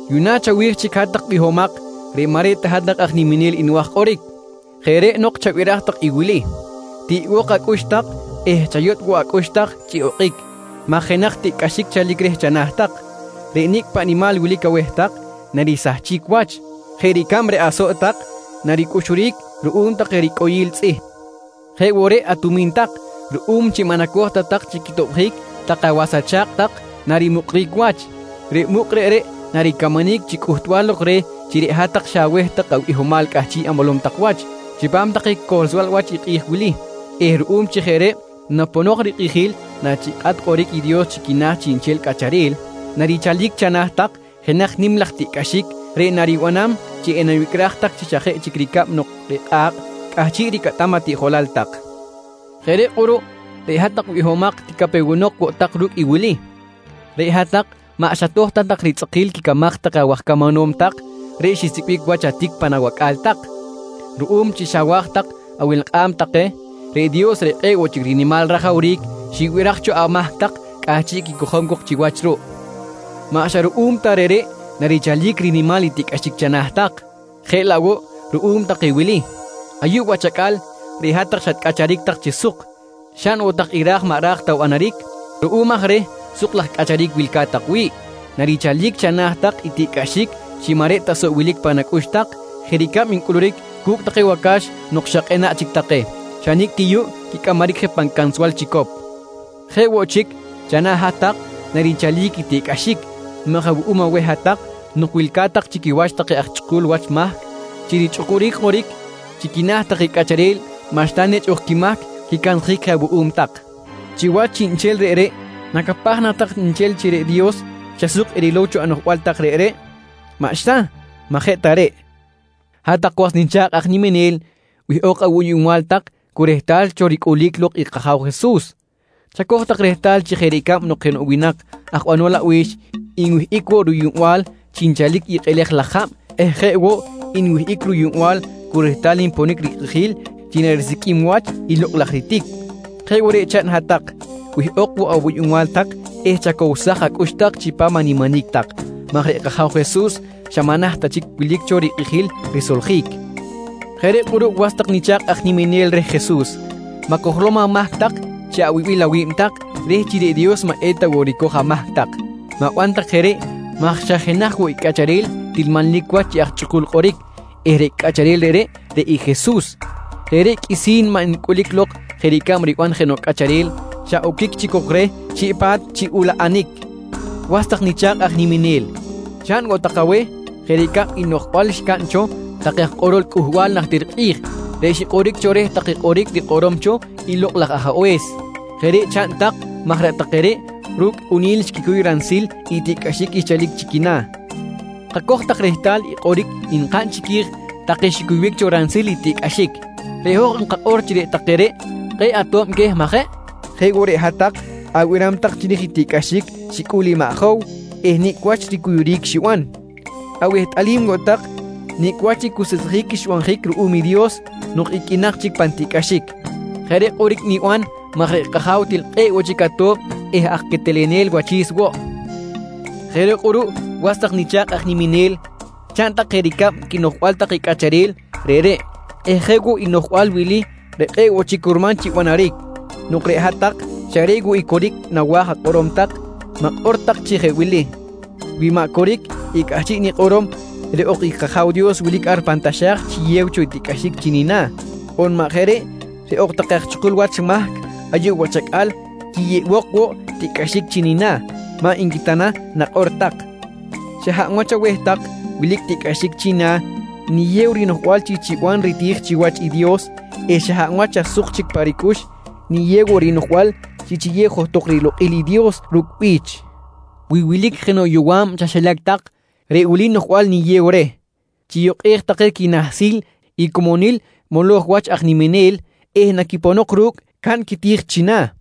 Yuꞌna chawi̱j chic hat-tak bihomak reꞌ maꞌ reꞌ ta hat-tak aj niminel nwa̱j kꞌoric. Jeꞌ nok chabiraj tak i wili: Tiꞌbok acꞌux tak eh chayotꞌ woꞌ acꞌux tak chi okꞌic maj jenaj tiꞌcꞌaxic chalic reh chana̱ tak. Reꞌ nicꞌ paꞌ nimal wilic aweh tak narisahchic wach. Jeꞌ ricab reꞌ asoꞌ tak naricꞌuxuric ruꞌum take ricꞌoyil tzꞌih. Jeꞌ woꞌ, reꞌ atumi̱n tak ruꞌum chi maꞌ nacoj ta tak chi quitobjic take awas acha̱kꞌ tak narimuꞌkric wach. Reꞌ muꞌk reꞌreꞌ naricamanic chi cꞌuhtbal lok reh chi reꞌ hat-tak xa aweh tak abihomal cꞌahchiꞌ amolom tak wach chipam take cohlsbal wach i kꞌi̱j wili eh ruꞌum chi jeꞌ reꞌ naponok rikꞌijil nachikꞌat kꞌoric i Dios chi quina̱ chiꞌnchel cꞌacharel, narichalic chana̱ tak jenaj nim laj tiꞌcꞌaxic reꞌ naribanam chi enawicꞌraj tak chi xa jeꞌ chic ricab nok reꞌ kꞌa̱kꞌ cꞌahchiꞌ ricꞌatam atiꞌjolal tak. Jeꞌ reꞌ kꞌuruꞌ reꞌ hat-tak bihomak ticapewenok woꞌ tak ru̱cꞌ i wili: Reꞌ hat-tak maꞌ xatoj ta tak ritzꞌakil quicamaj take awaj camanom tak reꞌ xisicꞌbic wach atic pan awacꞌa̱l tak. Ruꞌum chi xawa̱j tak awelkꞌam take, reꞌ Dios reꞌ kꞌe̱ꞌ woꞌ chic rinimal rajawric xibiraj cho amahc tak cꞌahchiꞌ quicojom cok chiwach ruꞌ. Maꞌ xa ruꞌum ta reꞌreꞌ narichalic rinimal i tiꞌcꞌaxic chana̱ tak, jeꞌ laꞌ woꞌ ruꞌum take wili: Ayuꞌ wach acꞌal reꞌ hat-tak xatcꞌacharic tak chi suk, xaꞌn woꞌ tak i ra̱j maꞌ raj ta banaric. Ruꞌum aj reh suk laj cꞌacharic wilca̱t tak wi̱ꞌ, narichalic chana̱ tak i tiꞌcꞌaxic chi maꞌ reꞌ ta soꞌ wilic pan acꞌux tak jeꞌ ricab ncꞌuluric cu̱cꞌ take wacax nok xa kꞌenaꞌ chic take, xa nicꞌ yuꞌ ti quicꞌamaric je pan cansbal chicop. Jeꞌ woꞌ chic chana̱ hat-tak narichalic i tiꞌcꞌaxic maj awuꞌum aweh hat-tak nok wilca̱t tak chi quiwach take aj chꞌukul wach mahc chi richꞌukuric kꞌoric chi quina̱ take cꞌacharel maꞌxta nechꞌ ok quimahc, quicansjic je awuꞌum tak. Chiwach chiꞌnchel reꞌreꞌ, nacapaj na tak nchel chi reꞌ Dios xa suk erilow cho anoꞌjbal tak reꞌreꞌ? Maꞌxta, maꞌ je ta reꞌ! Hat-tak was nicha̱kꞌ aj niminel, wihꞌok awuyuꞌnbal tak cu rehtal cho ricꞌulic lok i kAja̱w Jesus. Chacoj tak rehtal chi jeꞌ ricab nok jenoꞌ winak aj banol abi̱x nwihꞌic woꞌ ruyuꞌnbal chi nchalic i kꞌelej laj jab eh jeꞌ woꞌ nwihꞌic ruyuꞌnbal cu rehtal nponic rikꞌijil chi narisiqꞌuim i wach i lokꞌ laj ritic, jeꞌ woꞌ reꞌ chaꞌn hat-tak, wihꞌok woꞌ awuyuꞌnbal tak eh chacowsaj acꞌux tak chipam animinic tak maj reꞌ kAja̱w Jesus xa maꞌ naht ta chic wilic cho rikꞌijil risoljic. Jeꞌ reꞌ kꞌuruꞌ was tak nicha̱kꞌ aj niminel reh Jesus, ma̱cojlom amahc chi awibil awi̱b tak reh chi reꞌ Dios maꞌ eta woꞌ ricoj amahc tak. Ma̱ban tak jeꞌ reꞌ maj xa jenaj woꞌ i cꞌacharel til manlic wach chi aj chꞌukul kꞌoric eh reꞌ cꞌacharel reꞌreꞌ, reꞌ i Jesus. Reꞌreꞌ qꞌuisi̱n maꞌ ncꞌulic lok jeꞌ ricab riban jenoꞌ cꞌacharel xa oquic chic cok reh chiꞌ pa̱t chi ulaꞌanic. Was tak nicha̱kꞌ aj niminel, chaꞌn woꞌ tak aweh jeꞌ ricab i noꞌjbal xcaꞌn cho take aj kꞌorol cꞌuhbal najtir kꞌi̱j reꞌ xikꞌoric cho reh take kꞌoric rikꞌorom cho i Lokꞌ laj Ajabe̱s. Jeꞌ reꞌ chaꞌn tak maj reꞌ take reꞌ ru̱cꞌ kꞌuni̱l xquicuy ransil tiꞌcꞌaxic xchalic chi quina̱. Kacoj tak rehtal i kꞌoric nkaꞌn chiqui̱j take xicuybic cho ransil i tiꞌcꞌaxic. Reꞌ hoj nkakꞌor chi reꞌ take reꞌ kꞌe̱ꞌ ato̱b queh majeꞌ? Jeꞌ woꞌ reꞌ hat-tak abiram tak chiri̱j i tiꞌcꞌaxic xicꞌul i maꞌ Jow eh nicꞌ wach ricuyuric xiban. Awehtꞌalim woꞌ tak nicꞌ wach ricuseꞌsjic xbanjic ruꞌum i Dios nok iqꞌuinak chic pan tiꞌcꞌaxic. Jeꞌ reꞌ kꞌoric niban maj reꞌ kAja̱w til kꞌe̱ꞌ woꞌ chic ato̱b eh aj quetelenel wachi̱s woꞌ. Jeꞌ reꞌ kꞌuruꞌ was tak nicha̱kꞌ aj niminel, chaꞌn tak jeꞌ ricab quinoꞌjbal take cꞌacharel reꞌreꞌ eh jeꞌ woꞌ i noꞌjbal wili reꞌ kꞌe̱ꞌ woꞌ chic curman chi banaric: Nok reꞌ hat-tak xa reꞌ woꞌ i coric nawa̱j akꞌorom tak, ma̱kꞌor tak chi jeꞌ wili: «Wi maꞌ coric i cꞌahchiꞌ nikꞌorom, reꞌ ok i kAja̱w Dios wilic ar pan taxa̱j chiyew cho tiꞌcꞌaxic chi nina̱ on maꞌ jeꞌ reꞌ, reꞌ ok take aj chꞌukul wach mahc ayuꞌ wach acꞌal quiyeꞌbok woꞌ tiꞌcꞌaxic chi nina̱, maꞌ nqui ta na nakꞌor tak. Xa hab wach aweh tak wilic tiꞌcꞌaxic china̱ niyew rinoꞌjbal chi chiban riti̱j chiwach i Dios eh xa hab wach xa suk chic pa ricꞌux, niyew woꞌ rinoꞌjbal chi chiyew johtok rilokꞌil i Dios ru̱cꞌ bi̱ch. Wi wilic jenoꞌ yowa̱b chaxilac tak reꞌ wili noꞌjbal niyew reh: Chiyukꞌej take quinahsil i comonil moloj wach aj niminel eh naquiponok ru̱cꞌ, caꞌn quiti̱j china̱.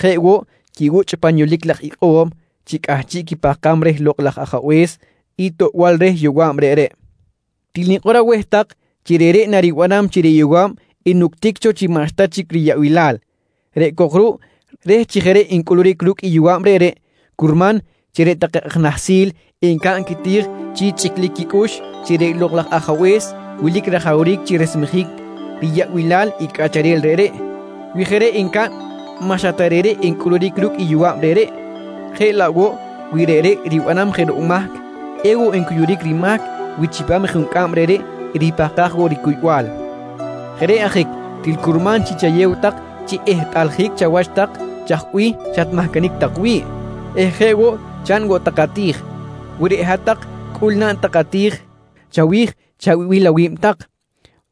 Jeꞌ woꞌ quibuchꞌ pan yolic laj ikꞌo̱m chi cꞌahchiꞌ quipahkam reh Lokꞌ laj Ajabe̱s i toꞌbal reh yowa̱b reꞌreꞌ. Til nikꞌor aweh tak, chi reꞌreꞌ naribanam chi reꞌ yowa̱b enuctic cho chi maꞌxta chic riyaꞌbilal, reꞌ cok ruꞌ reh chi jeꞌ reꞌ encꞌuluric ru̱cꞌ i yowa̱b reꞌreꞌ, curman chi reꞌ take aj nahsil encaꞌn quiti̱j chi chꞌiclic quicꞌux chi reꞌ Lokꞌ laj Ajabe̱s wilic rajawric chi resmejic riyaꞌbilal i cꞌacharel reꞌreꞌ. Wi jeꞌ reꞌ encaꞌn, maꞌ xa ta reꞌreꞌ encꞌuluric ru̱cꞌ i yowa̱b reꞌreꞌ, jeꞌ laꞌ woꞌ wi reꞌreꞌ ribanam jenoꞌ mahc, ewoꞌ ncuyuric rimahc wi chipam i juncꞌam reꞌreꞌ eripahkaj woꞌ ricuybal. Jeꞌ reꞌ ajic til curman chi chayew tak chi ehtꞌaljic chawach tak chaj bih xatmahcanic tak wi̱ꞌ eh jeꞌ woꞌ chaꞌn woꞌ tak ati̱j. Wi reꞌ hat-tak cꞌul naꞌn tak ati̱j chawi̱j chawibil awi̱b tak,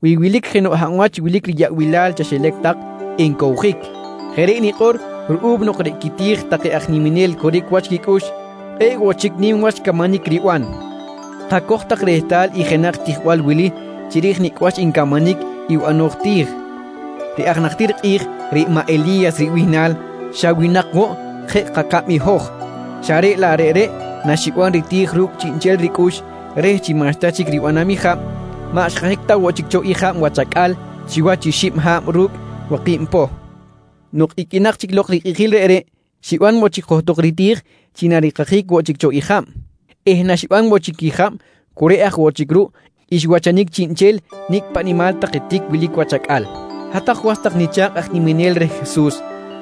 wi wilic jenoꞌ hab wach wilic riyaꞌbilal chaxilac tak encowjic. Jeꞌ reꞌ nikꞌor ruꞌum nok reꞌ quiti̱j take aj niminel coric wach quicꞌux kꞌe̱ꞌ woꞌ chic nim wach camanic riban. Kacoj tak rehtal i jenaj tijbal wili chiri̱j nicꞌ wach ncamanic i banoj ti̱j: Reꞌ aj najtir kꞌi̱j reꞌ maꞌ Eli̱yas ribihnal xa winak woꞌ jeꞌ kacab i hoj, xa reꞌ laꞌ reꞌreꞌ naxiban riti̱j ru̱cꞌ chiꞌnchel ricꞌux reh chi maꞌxta chic ribanam i jab, maꞌ xkajic ta woꞌ chic cho i jab wach acꞌal chiwach i xib ha̱b ru̱cꞌ waki̱b poh. Nok iqꞌuinak chic lok rikꞌijil reꞌreꞌ, xiban woꞌ chic johtok riti̱j chi narikajic woꞌ chic cho jab eh naxiban woꞌ chic i jab cu reꞌ aj woꞌ chic ruꞌ xwachanic chiꞌnchel nicꞌ paꞌ nimal take tic wilic wach acꞌal. Hat-tak was tak nicha̱kꞌ aj niminel reh Jesus,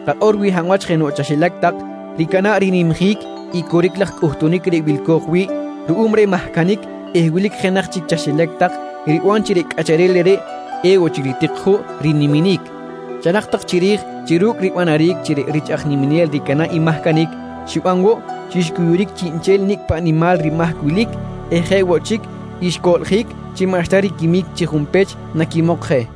kakꞌor wi hab wach jenoꞌ chaxilac tak ricana̱ꞌ rinimjic i coric laj cꞌuhtunic reꞌ wilco̱j wi̱ꞌ ruꞌum reh mahcanic eh wilic jenaj chic chaxilac tak riban chi reꞌ cꞌacharel reꞌreꞌ ewoꞌ chic ritik juꞌ riniminic, charak tak chiri̱j chi ru̱cꞌ ribanaric chi reꞌ rich aj niminel ricana̱ꞌ i mahcanic, xiban woꞌ chi xcuyuric chiꞌnchel nicꞌ paꞌ nimal rimahc wilic eh jeꞌ woꞌ chic, xcoꞌljic chi maꞌxta riquimic chi junpech naquimok je.